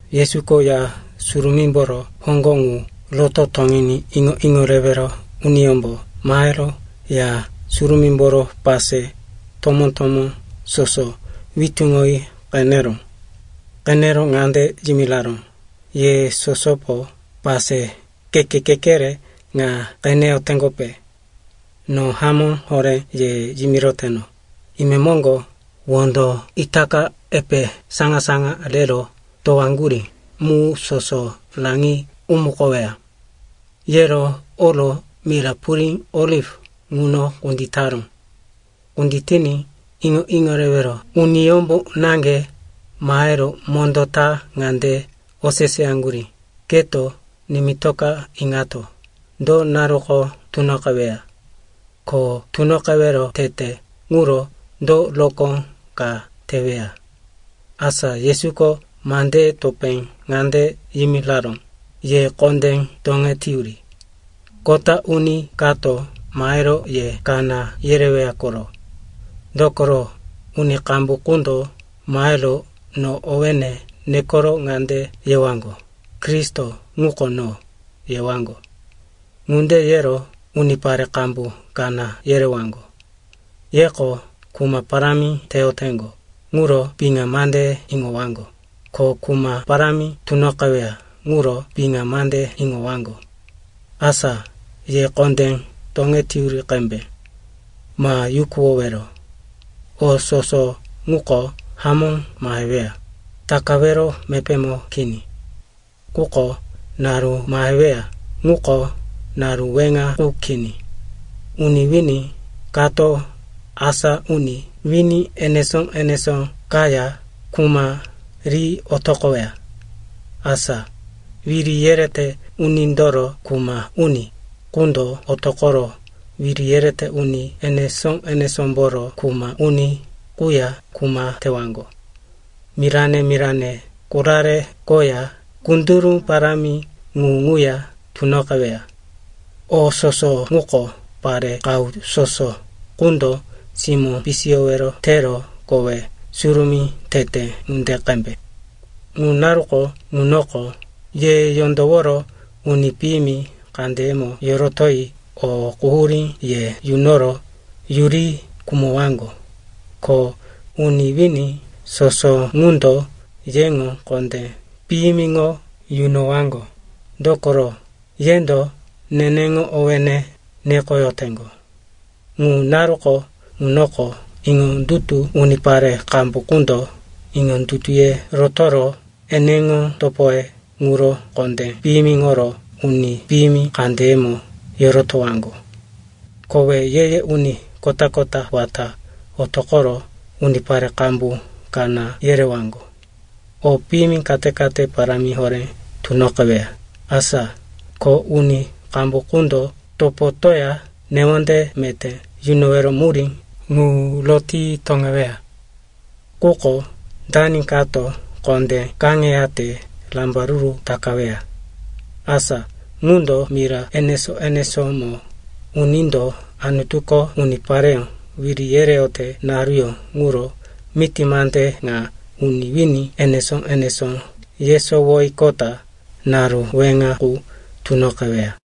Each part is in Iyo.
Yesuko Ya Surumímboro hoŋgo ŋu roto toŋiní iŋo-iŋo rewero uniyómbo mahero Ya Surumímboro pase tomó-tomó soso witúŋoyi qeneró. Qenero ŋande yimiraró, “Ye sosopo pase keke-kekere ŋa qeneyoteŋgope? No hamó horé ye yimiroteno, imemoŋgo wondo itaka epe saŋa-saŋa rero towaŋgurí mu soso raŋi umukoweya.” Yero oro mira purí Oliv ŋuno kunditaró. Kunditiní iŋo-iŋo rewero uniyómbo naŋge mahero mondó ta ŋande oseseyaŋgurí, “Keto nimitoka iŋato, do naruko tunoqeweya? Ko tunoqewero tete ŋuro do rokó ka teweya?” Asa Yesuko mandeye topé ŋande yimiraró, “Ye kondé toŋeteyuri. Kota uni kato mahero ye kaná yereweya koro. Dokoro, uni qambu qundo mahero no owéne nekoro ŋande yewaŋgo, ‘Kristo ŋuko no,’ yewaŋgo. Ŋunde yero unipare qambu kaná yerewaŋgo. Yeko kuma parámi teyoteŋgo ŋuro piŋa mande iŋowaŋgo, ko kuma parámi tunoqeweya ŋuro piŋa mande iŋowaŋgo. Asa ye kondé toŋeteyuri qembe. Ma yukuwowero. O soso ŋuko hamó maheweya, takawero mepémo kini. Quko naru maheweya ŋuko naru weŋa qu kini. Uni wini kato asa uni wini enesó-enesó kaya kuma ri otoqoweya. Asa wiri yerete unindoro kuma uni qundo otoqoro wiri yerete uni enesó-enesómboro kuma uni quya kuma tewaŋgo. Mirane-mirane korare koya kunduru parámi ŋu ŋuya tunoqeweya. O soso ŋuko pare qahu soso qundo simó pisiyowero tero kowe surumí tete ŋunde qembe. “Ŋu naruko ŋunoko ye yondoworo uni piyimi kandeyemo yorotoyi o quhurí ye yunoro yuri khumowaŋgo. Ko uni wini soso ŋundo yeŋo kondé piyimiŋo yunowaŋgo, dokoro yendo neneŋo owéne nekoyoteŋgo. Ŋu naruko ŋunoko iŋondutu unipare qambu qundo iŋondutuye rotoro eneŋo topoye ŋuro kondé piyimiŋoro uni piyimi kandeyemo yorotowaŋgo. Kowe ye-ye uni kota-kota wata otoqoro unipare qambu kaná yerewaŋgo. O piyimi kate-kate parámi horé tunoqeweya, asa ko uni qambu qundo topotoya newonde meté yunowero murí ŋu roti toŋeweya. Quko dani kato kondé kaŋeyate rambaruru takaweya. Asa ŋundo mira enesó-enesómo unindo Anutuko unipareyó wiri yereyote naruyó ŋuro miti mande ŋa uni wini enesó-enesó yesowoyiqota naru weŋa qu tunoqeweya.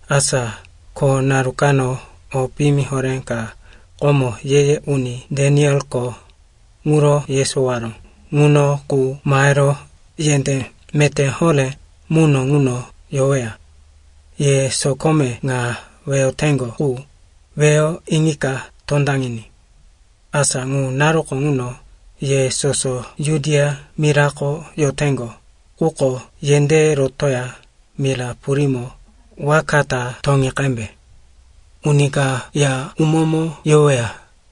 “Asa ko naru kano o piyimi horé ka komo ye-ye uni Danielko ŋuro yesowaró ŋuno qu mahero yendé meté horé muno ŋuno yoweya. (Ye sokome ŋa weyoteŋgo qu, weyo iŋika tondaŋiní.) Asa ŋu naruko ŋuno ye soso Judia mirako yoteŋgo quko yendéye rotoya mira purímo waka ta toŋi qembe. Uni ka ya umómo yoweya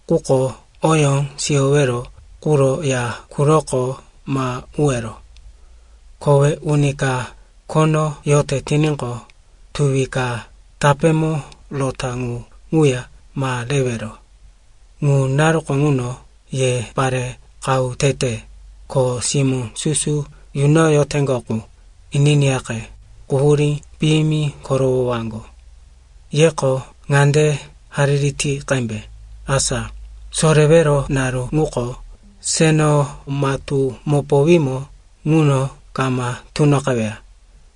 quko oyó siyowero quro ya quroko ma uwero. Kowe uni ka khono yote tiníqo, tuwi ka tapémo rota ŋu ŋuya ma rewero. Ŋu naruko ŋuno ye pare qahu tete, ko simó susu yunoyoteŋgo qu, ininiyaqe, quhurí piyimi korowowaŋgo. Yeko ŋande hariri ti qembe, asa sorewero naru ŋuko seno matú mopowímo ŋuno kama tunoqeweya,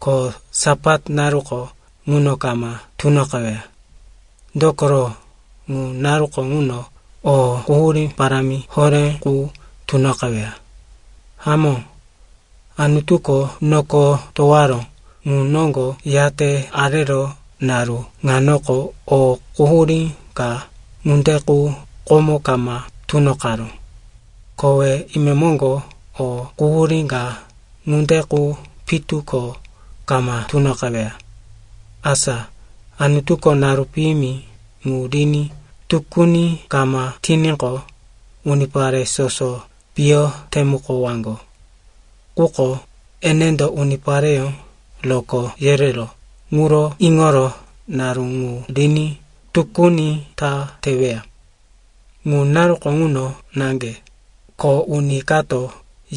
ko Sapat naruko ŋuno kama tunoqeweya. Dokoro ŋu naruko ŋuno o quhurí parámi horé qu tunoqeweya. Hamó, Anutuko noko towaró ŋu noŋgo yate arero naru ŋanoko, o quhurí ka ŋunde qu komo kama tunoqaró. Kowe imemoŋgo o quhurí ka ŋunde qu pitu ko kama tunoqeweya. “Asa Anutuko naru piyimi ŋu riní tukuni kama tiníqo, unipare soso piyo temukowaŋgo. Quko enendo unipareyó rokó yereró ŋuro iŋoro naru ŋu riní tukuni ta teweya. Ŋu naruko ŋuno naŋge, ko uni kato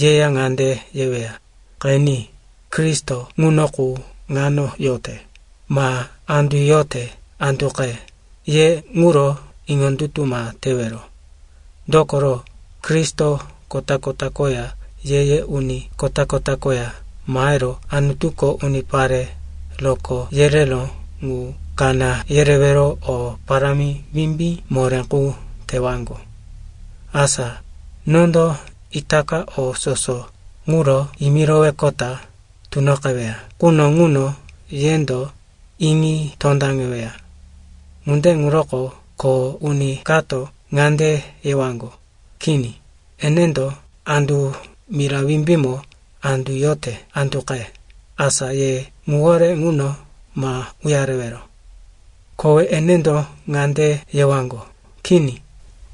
yeya ŋande yeweya, ‘Qeni, Kristo ŋuno qu ŋano yote,’ ma ‘Andu yote anduqe,’ ye ŋuro iŋondutu ma tewero. Dokoro, Kristo kota-kota koya ye-ye uni kota-kota koya mahero Anutuko unipare rokó yereró ŋu kaná yerewero o parámi wimbí moré qu tewaŋgo. Asa nondo itaka o soso ŋuro yimiroweqota tunoqeweya quno ŋuno yendo iŋi tondaŋeweya. “Ŋunde ŋuroko ko uni kato ŋande yewaŋgo, ‘Kini, enendo andu mira wimbímo andu yote anduqe,’ asa ye ŋuwore ŋuno ma uyarewero. Kowe enendo ŋande yewaŋgo, ‘Kini,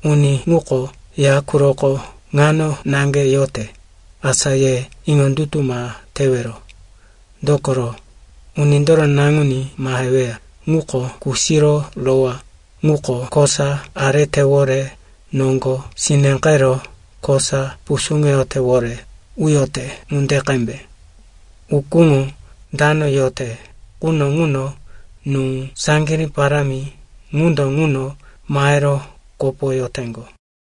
uni ŋuko ya quroko ŋano naŋge yote,’ asa ye iŋondutu ma tewero. Dokoro Unindoro Naŋuní maheweya ŋuko kusiro rowá ŋuko kosa aretewore noŋgo sineqero kosa pusuŋetewore uyote ŋunde qembe. Ukúŋo dano yote quno ŋuno nú saŋgirí parámi ŋundo ŋuno mahero kopoyoteŋgo.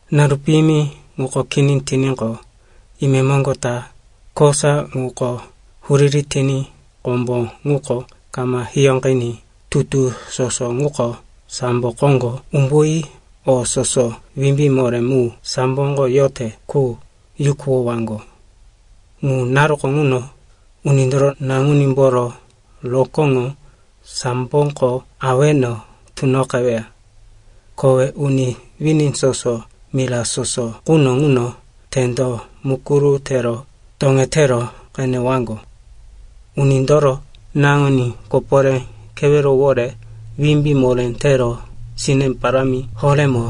“Naru piyimi ŋuko kini tiníqo, imemoŋgo ta “‘kosa ŋuko huriri tiní kombo ŋuko kama hiyóqiní tutu soso ŋuko sambo koŋgo umbuyi o soso wimbí moré mu samboko yote qu yukuwowaŋgo.’ “Ŋu naruko ŋuno Unindoro Naŋunímboro rokóŋo samboko aweno tunoqeweya. Kowe uni wini soso mira soso quno ŋuno tendo mukuru tero toŋetero qenewaŋgo. Unindoro Naŋuní koporé kewerowore wimbí moré tero sine parámi horémo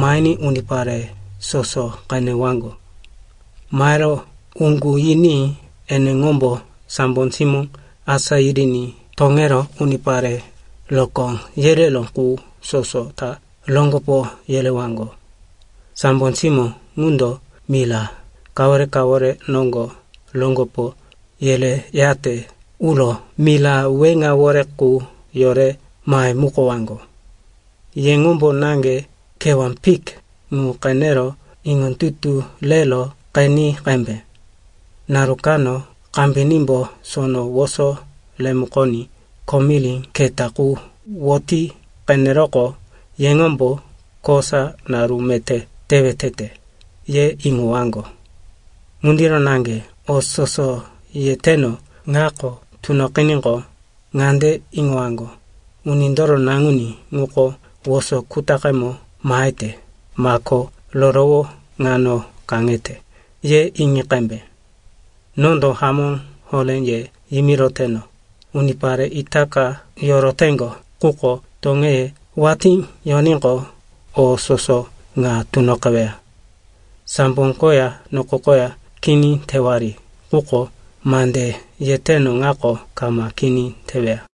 mahiní unipare soso qenewaŋgo. Mahero uŋgu yiní eneŋombo sambo simó asá yiriní toŋero unipare rokó yereró qu soso ta roŋgopo yerewaŋgo. Sambo simó ŋundo mira kawore-kawore noŋgo roŋgopo yereyate uro mira weŋawore qu yore mahemukowaŋgo.” “Yeŋombo naŋge kewá fik ŋu qenero iŋondutu rero qeni qembe. Naru kano kambinímbo sono woso remukoní komiri keta qu woti qeneroqo, yeŋombo, kosa naru meté tewe tete, ye iŋowaŋgo. Ŋundiro naŋge o soso yeteno ŋako tunoqiníqo, ŋande iŋowaŋgo, Unindoro Naŋuní ŋuko woso kutaqemo mahete, mako rorowo ŋano kaŋete, ye iŋi qembe. Nondo hamó horé ye yimiroteno, unipare itaka yoroteŋgo quko toŋeye watí yoníqo, o soso ŋa tunoqeweya. Sambo koya noko koya kini tewari, quko mande yeteno ŋako kama kini teweya.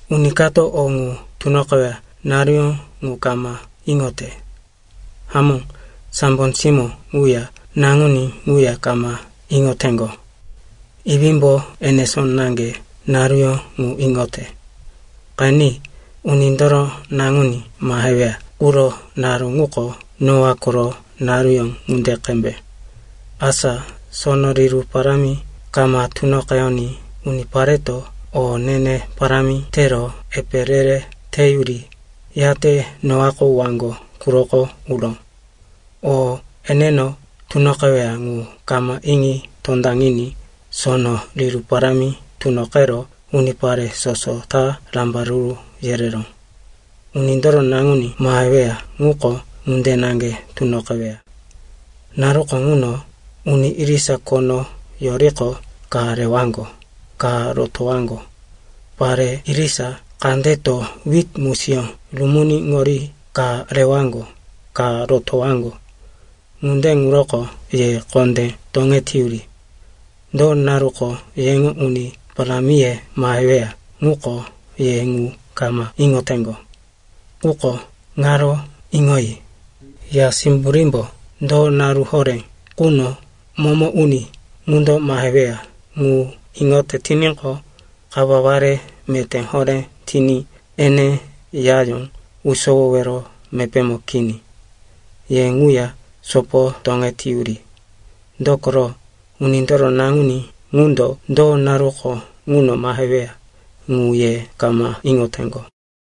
“Uni kato o ŋu tunoqeweya naruyó ŋu kama iŋote. Hamó, sambo simó ŋuya Naŋuní ŋuya kama iŋoteŋgo. Iwímbo enesó naŋge naruyó ŋu iŋote. Qeni, Unindoro Naŋuní maheweya quro naru ŋuko Noa koro naruyó ŋunde qembe. Asa sono riru parámi kama tunoqeyoní unipareto o ne-ne parámi tero epe re-re teyuri, yate Noako waŋgo quroko uró. O eneno tunoqeweya ŋu kama iŋi tondaŋiní sono riru parámi tunoqero unipare soso ta rambaruru yereró. Unindoro Naŋuní maheweya ŋuko ŋunde naŋge tunoqeweya. Naruko ŋuno uni irisa khono yoriqo ka rewaŋgo, ka rotowaŋgo. Pare irisa kandeto wit musiyó rumuniŋori ka rewaŋgo, ka rotowaŋgo. “Ŋunde ŋuroko ye kondé toŋeteyuri. Do naruko yeŋo uni parámiye maheweya ŋuko ye ŋu kama iŋoteŋgo. Quko ŋaro iŋoyi, ya simburímbo do naru horé ŋuno momo uni ŋundo maheweya ŋu iŋote tiníqo, kawaware meté horé tiní ene yayó usowowero mepémo kini. Ye ŋuya sopo toŋete yuri. Dokoro Unindoro Naŋuní ŋundo do naruko ŋuno maheweya, ŋu ye kama iŋoteŋgo.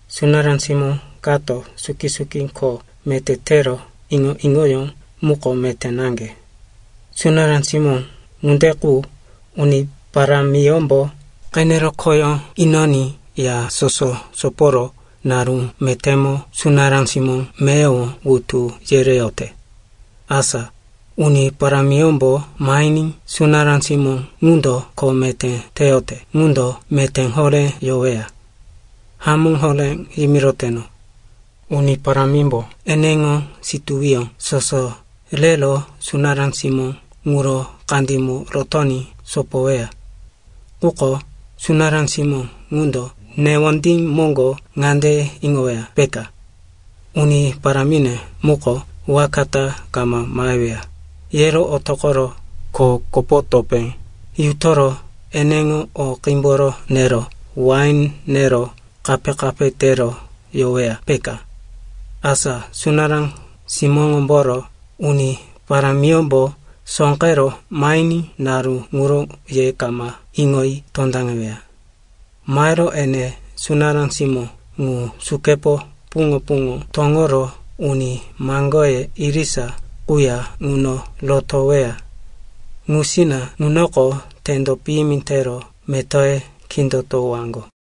“Sunará simó kato suki-suki kho meté tero iŋo-iŋoyó muko meté naŋge. Sunará simó ŋunde qu uni parámiyómbo qenero khoyó inoní ya soso soporo naru metémo sunará simó meyowo wutu yereyote. Asa uni parámiyómbo mahiní sunará simó ŋundo kho meté teyote ŋundo meté horé yoweya. Hamó horé yimiroteno, uni parámimbo eneŋo situwiyó soso rero sunará simó ŋuro kandímo rotoní sopoweya. Quko sunará simó ŋundo newondí moŋgo ŋande iŋoweya, peka, uni parámine muko waka ta kama maheweya, yero otoqoro kho kopo topé yutoro eneŋo o qímboro nero wain nero kape-kape tero yoweya, peka. Asa sunará simóŋomboro uni parámiyómbo sóqero mahiní naru ŋuro ye kama iŋoyi tondaŋeweya. Mahero ene sunará simó ŋu sukepo puŋo-puŋo toŋoro uni maŋgoye irisa quya ŋuno rotoweya. Ŋusina ŋunoko tendo piyimi tero metoye kindotowaŋgo.